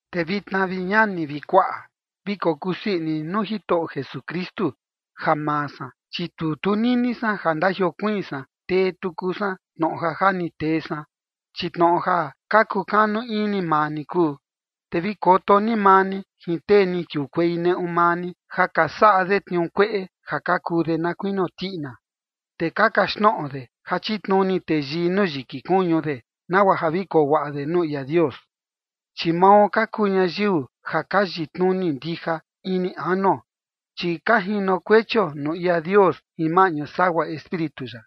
Te vitna, vi ñani vi kuaꞌa, vi kokusii ini ni nuu Jitoꞌo Jesukristu. Ja maa san, chi tu tunini san ja ndajiokuiin san tee tuku san tnoꞌo ja ja ni tee san, chi tnoꞌo ja ka kukanu ini maa ni kuu. Te vi koto ni maa ni jin tee ni kiukuei neꞌu maa ni ja ka saꞌa de tniuu kueꞌe ja ka kuu de na kuinio tiꞌina. Te ka kaxtnoꞌo de ja chitnuni teyii nuu yiki kuñu de nagua ja vi koo guaꞌa de nuu ia Dios. Chi mao ka kuu ñayiu ja ka yitnuni ndija ini anuo, chi ka jinokuechio nuu ia Dios jin maꞌñu sagua Espíritu ya,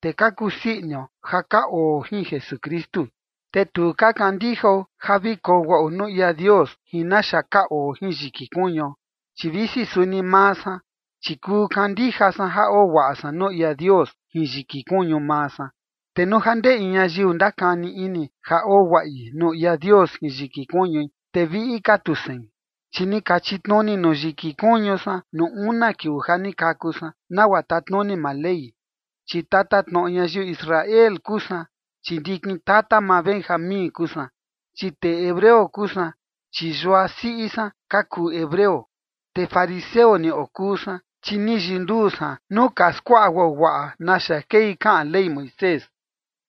te ka kusii inio ja ka oo jin Jesukristu. Te tu ka kandijao ja vi koo guaꞌo nuu ia Dios jin naxa ka oo jin yiki kuñuo. Chi visi suni maa san, chi kuu kandija san ja oo guaꞌa san nuu ia Dios jin yiki kuñu maa san. Te nuu ja ndee in ñayiu ndakani ini ja oo guaꞌi nuu ia Dios jin yiki kuñui, te viꞌi ka tu sein. Chi ni ka chitnuni nuu yiki kuñu san nuu una kiuu ja ni kaku san, nagua tatnuni maa Ley, chi tatatnoꞌo ñayiu Israel kuu san, chi ndikin tata maa Benjamín kuu san, chi tee hebreo kuu san, chi yua siꞌi san ka kuu hebreo. Te fariseo ni okuu san, chi ni yinduu san nuu ka skuaꞌa guaguaꞌa naxa kei kaꞌan Ley Moisés.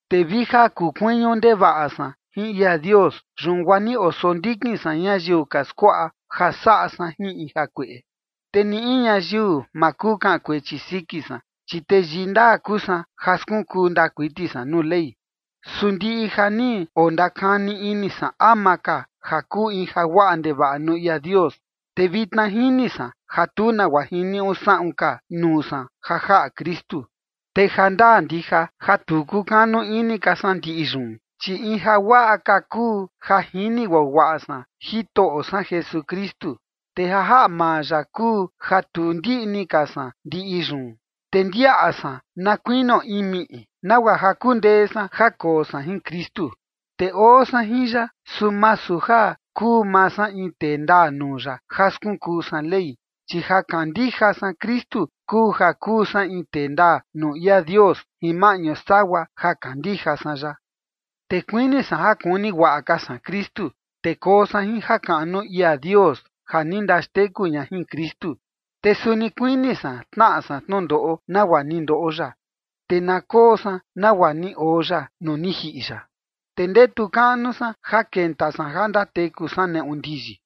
Te vi ja kukuiñu ndevaꞌa san jin ia Dios, yun guaa ni osondikin san ñayiu ka skuaꞌa ja saꞌa san jin in jakueꞌe. Te ni in ñayiu ma kuu kaꞌan kuechi siki san, chi teyii ndaa kuu san ja skunkuu ndaa kuiti san nuu Ley. Su ndiꞌi ja ni ondakani ini san ama ka ja kuu in jaguaꞌa ndevaꞌa nuu ia Dios, te vitna jini san ja tu nagua jiniuꞌu saꞌun ka nuu san ja jaꞌa Kristu. Te ja ndaa ndija ja tu kukanu ini ka san ndiꞌi yun, chi in jaguaꞌa ka kuu ja jini guaguaꞌa san Jitoꞌo san Jesukristu. Te ja jaꞌa maa ya kuu ja tu ndiꞌni ka san ndiꞌi yun, te ndiaꞌa san na kuinio in miꞌi, nagua ja kundee san ja koo san jin Kristu. Te oo san jin ya, su masu ja kuu maa san in tee ndaa nuu ya ja skunkuu san Ley, chi ja kandija san Kristu kuu ja kuu san in tee ndaa nuu ia Dios jin maꞌñu sagua ja kandija san ya. Te kuini san ja kuni guaꞌa ka san Kristu, te koo san jin jakaꞌnu ia Dios ja ni ndaxteku ña jin Kristu. Te suni kuini san tnaꞌa san tnundoꞌo nagua ni ndoꞌo ya, te na koo san nagua ni oo ya nuu ni jiꞌi ya, te ndetu kaꞌnu san ja kenta san ja ndateku san neꞌu ndiyi.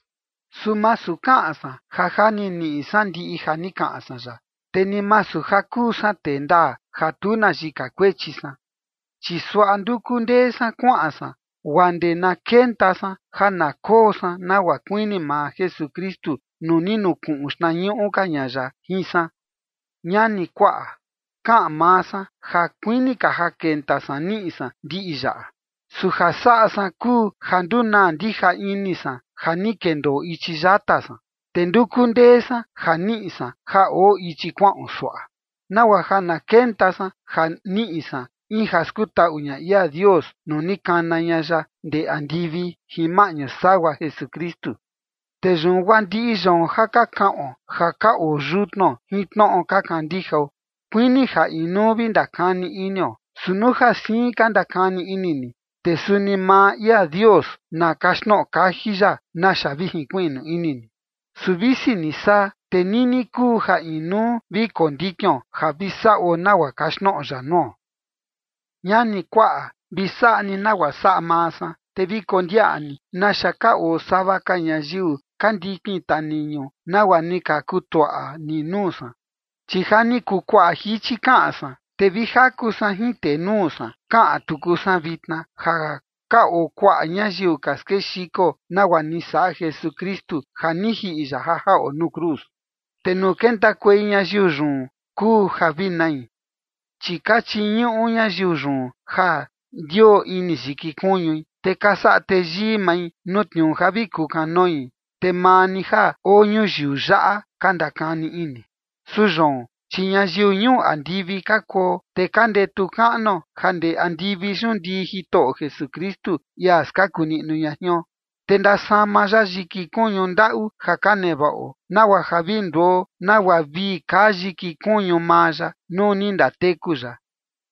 Su masu kaꞌan san ja ja ni niꞌi san ndiꞌi ja ni kaꞌan san yaꞌa. Te ni masu ja kuu san tee ndaa ja tu na yika kuechi san, chi suaꞌa nduku ndee san kuaꞌan san guaa ndee na kenta san ja na koo san nagua kuini maa Jesukristu nuu ni nukuꞌun xtnañuꞌu ka ña ya jin san. Ñani, kuaꞌa, kaꞌan maa san ja kuini ka ja kenta san niꞌi san ndiꞌi yaꞌa, su ja saꞌa san kuu ja ndunaa ndija ini san ja ni kendoo ichi yata san, te nduku ndee san ja niꞌi san ja oo ichi kuaꞌon suaꞌa, nagua ja na kenta san ja niꞌi san, in ja skutaꞌu ña ia Dios nuu ni kana ña ya ndee andivi jin maꞌñu sagua Jesukristu. Te yun guaa ndiꞌi yoon ja ka kaꞌon ja ka oo yutnuo jin tnoꞌo ka kandijao, kuini ja inuu vi ndakani inio. Su nuu ja siin ka ndakani ini ni, te suni maa ia Dios na kaxtnoꞌo kaji ya naxa vi jinkuiꞌnu ini ni. Su visi ni saa, te nini kuu ja inuu vi kondikion ja vi saꞌo nagua kaxtnoꞌo ya nuo. Ñani, kuaꞌa, vi saꞌa ni nagua saꞌa maa san, te vi kondiaꞌa ni naxa ka oo sava ka ñayiu ka ndikin taniñu nagua ni ka kutuaꞌa ni nuu san. Chi ja ni kuu kuaꞌa jichi kaꞌan san, te vi jaku san jin tenuu san kaꞌan tuku san vitna, ja ka oo kuaꞌa ñayiu ka skexiko nagua ni saꞌa Jesukristu ja ni jiꞌi ya ja jaꞌo nuu cruz. Te nuu kentakuei ñayiu yun kuu ja vi nai, chi ka chiñuꞌu ñayiu yun ja ndioo ini yiki kuñui, te ka saꞌa teyii mai nuu tniuu ja vi kukanoi, te maa ni ja oo ñuyiu yaꞌa ka ndakani ini. Su yoon, chi ñayiu ñuu andivi ka kuo, te ka ndetu kaꞌnuo ja ndee andivi yun ndii Jitoꞌo Jesukristu, ia skaku niꞌnu ña jion, te ndasama ya yiki kuñu ndaꞌu ja ka nevaꞌo, nagua ja vi nduo nagua vii kaa yiki kuñu maa ya nuu ni ndateku ya.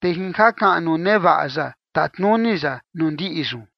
Te jin jakaꞌnu nevaꞌa ya tatnuni ya nuu ndiꞌi yun.